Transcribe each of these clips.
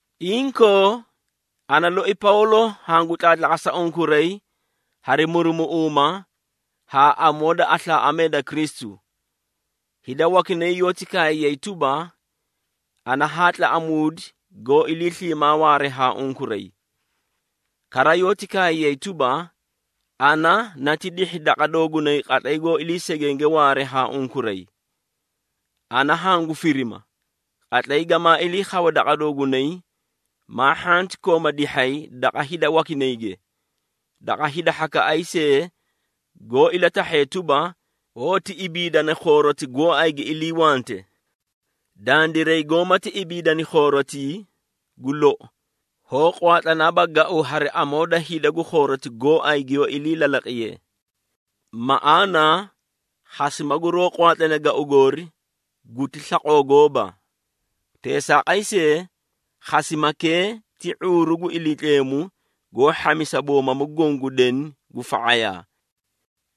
Inkoo, ana loi Pawlo hangu tlaatlaqasa unkuray hari murumuꞌuuma haa amoo da aslaaꞌamee da Kristu. Hida wakinay yoóti kaayay tuba, ana haa tlaꞌamuudi goó ilii sliimaa waaree haa unkuray. Kara, yoóti kaayay tuba, ana nati dihhi daqa doogunay qatlay goó ilii segenge waaree haa unkuray. Ana hangu firima, qatlay gamaa ilii khawe daqa doogunay, maa hhanti kooma dihhay daqa hida wakinayge, daqa hida hhakaꞌay see goó ilatahhee tuba, hoóti ibiidana khooroti gooay gi iliiwante. Dandiray, goómati ibiidani khoorotii, gu lou hoó qwaatlanaaba gau hari amoo da hida gu khooroti gooay giyoó ilii lalaqiyee. Maꞌaana, khasima guroó qwaatlane gau goori guti slaqoo gooba. Teesaaqay see, khasimakee ti ⁄uuru gu Iliitleemu goó hhamisa boomamu goõ gu deni gu fa⁄ayaa.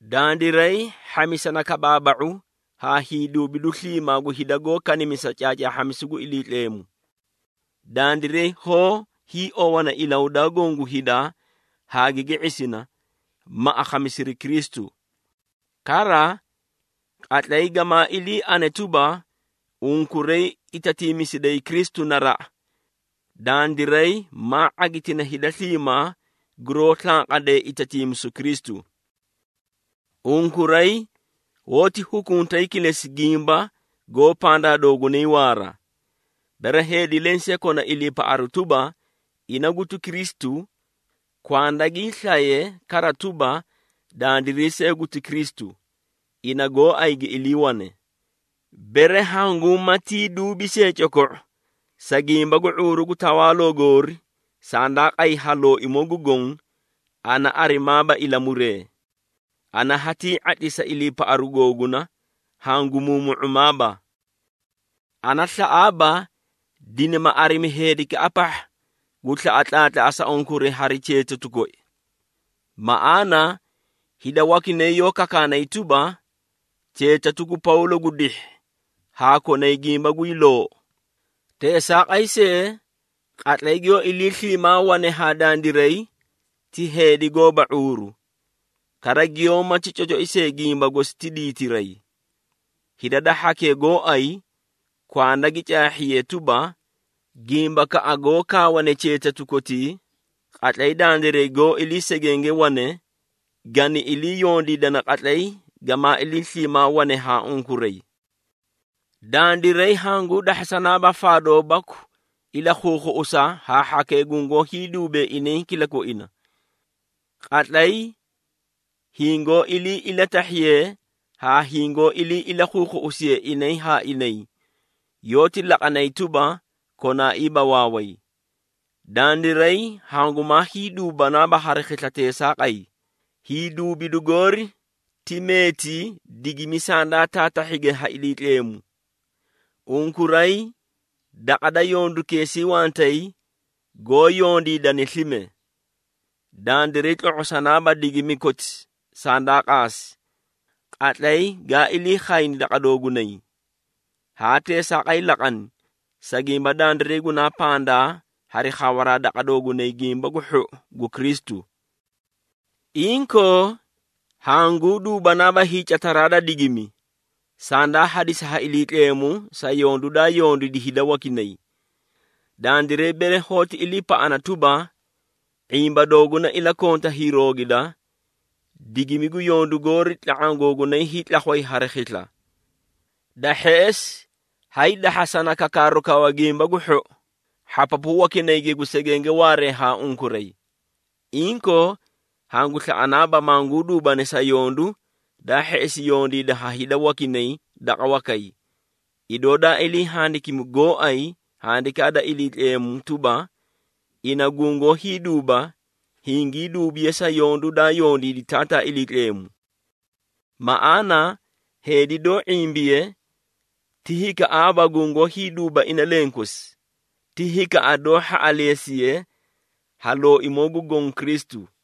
Dandiray, hhamisana kabaaba⁄u haa hiiduubidu sliimaa gu hida goó kanimisa caacaahhamisu gu Iliitleemu. Dandiray hoó hiiowana ilahudaa goõ gu hida haa gigi ⁄isina, ma akhamisiri Kristu. Kara, qatlay gamaa ilii ane tuba, unkuray itatiimisiday Kristu naraꞌa, dandiray maa ⁄agitina hida sliimaa guroó slanqadee itatiimisu Kristu. Unkuray hoóti khuꞌuntay kilesi gimba goó pandaa doogunay waara. Bere heedi lensee kona iliipaꞌaru tuba, ina guti Kristu, kwanda gii slaye kara tuba, dandiray see guti Kristu, ina gooay gi iliiwane. Bere hangumatii duubi see coko⁄u, sa gimba gu ⁄uuru gu tawaaloo goori, sandaa qay ha Looimoo gu Goõ, ana arimaaba ilamuree. Ana hatii ⁄atlisa iliipaꞌaru googuna, hagu muumu⁄umaaba. Ana slaꞌaaba dinima arimi heedikaꞌa pahha gu slaꞌa tlaatlaꞌasa unkuray hari cheetatu koi. Maꞌaana, hida wakinay yoó kakaakani tuba, “Cheetatu gu Pawlo gu dihhi haa konay gimba guy loou. Teesaaqay see, qatlay giyoó ilii sliimaa wane haa dandiray ti heedi gooba ⁄uuru, kara giyoómati cocoi see gimba gosi ti diitiray.” Hida da hhakee gooay kwanda gi caahhiyee tuba, gimbakaꞌa goó kaawane cheetatu kotii, qatlay dandiray goó ilii segenge wane, gani ilii yondiidana qatlay gamaa ilii sliimaa wane haa unkuray. Dandiray hanguu dahhasanaaba faadoo baku ilakhuukhuꞌusa haa hhakee gungoó hiiduubee inay kilakoina. Qatlay hingoó ilii ilatahhiyee haa hingoó ilii ilakhuukhuꞌusiyee inay haa inay, yoóti laqanay tuba, konaaiiba waaway. Dandiray hangumaa hiiduubanaaba hari khisla teesaaqay, hiiduubidu goori ti meeti digimi sandaa taatahhige ha Iliitleemu. Unkuray daqa da yondukeesii wantay, goó yondiidane slime. Dandiray tlo⁄osanaaba digimi koti sandaa qaasi, qatlay gaa ilii khayni daqa doogunay. Haa teesaaqay laqani, sa gimba dandiray gunaa pandaa hari khawaraa daqa doogunay Gimba gu Hhou gu Kristu. Inkoo, hanguu duubanaaba hiicataraa da digimi, sandaa hadisi ha Iliitleemu sa yondu daa yondiidi hida wakinay. Dandiray bere hoóti iliipaꞌana tuba, ⁄imba dooguna ilakonta hiiroogida, digimi gu yondu goori tla⁄aã googunay hiitlakhway hari khisla. Da hheꞌesi, haydahhasana kakaaru kawa Gimba gu Hhou hhapapu wakinayge gu segenge waaree haa unkuray. Inkoo, hangu slaꞌanaaba manguu duubani sa yondu, daa hheꞌesi yondiida ha hida wakinay daqa wakay. Idoo daa ilii handikimi gooay Handikaa da Iliitleemu tuba, “Ina gungoó hiiduuba, hingii duubiye sa yondu, daa yondiidi Taataa Iliitleemu.” Maꞌaana heedi doó ⁄imbiye, ti hikaꞌaaba gungoó hiiduuba ina lenkosi, ti hikaꞌa doó hhaꞌaleesiye ha Looimoo gu Goõ Kristu.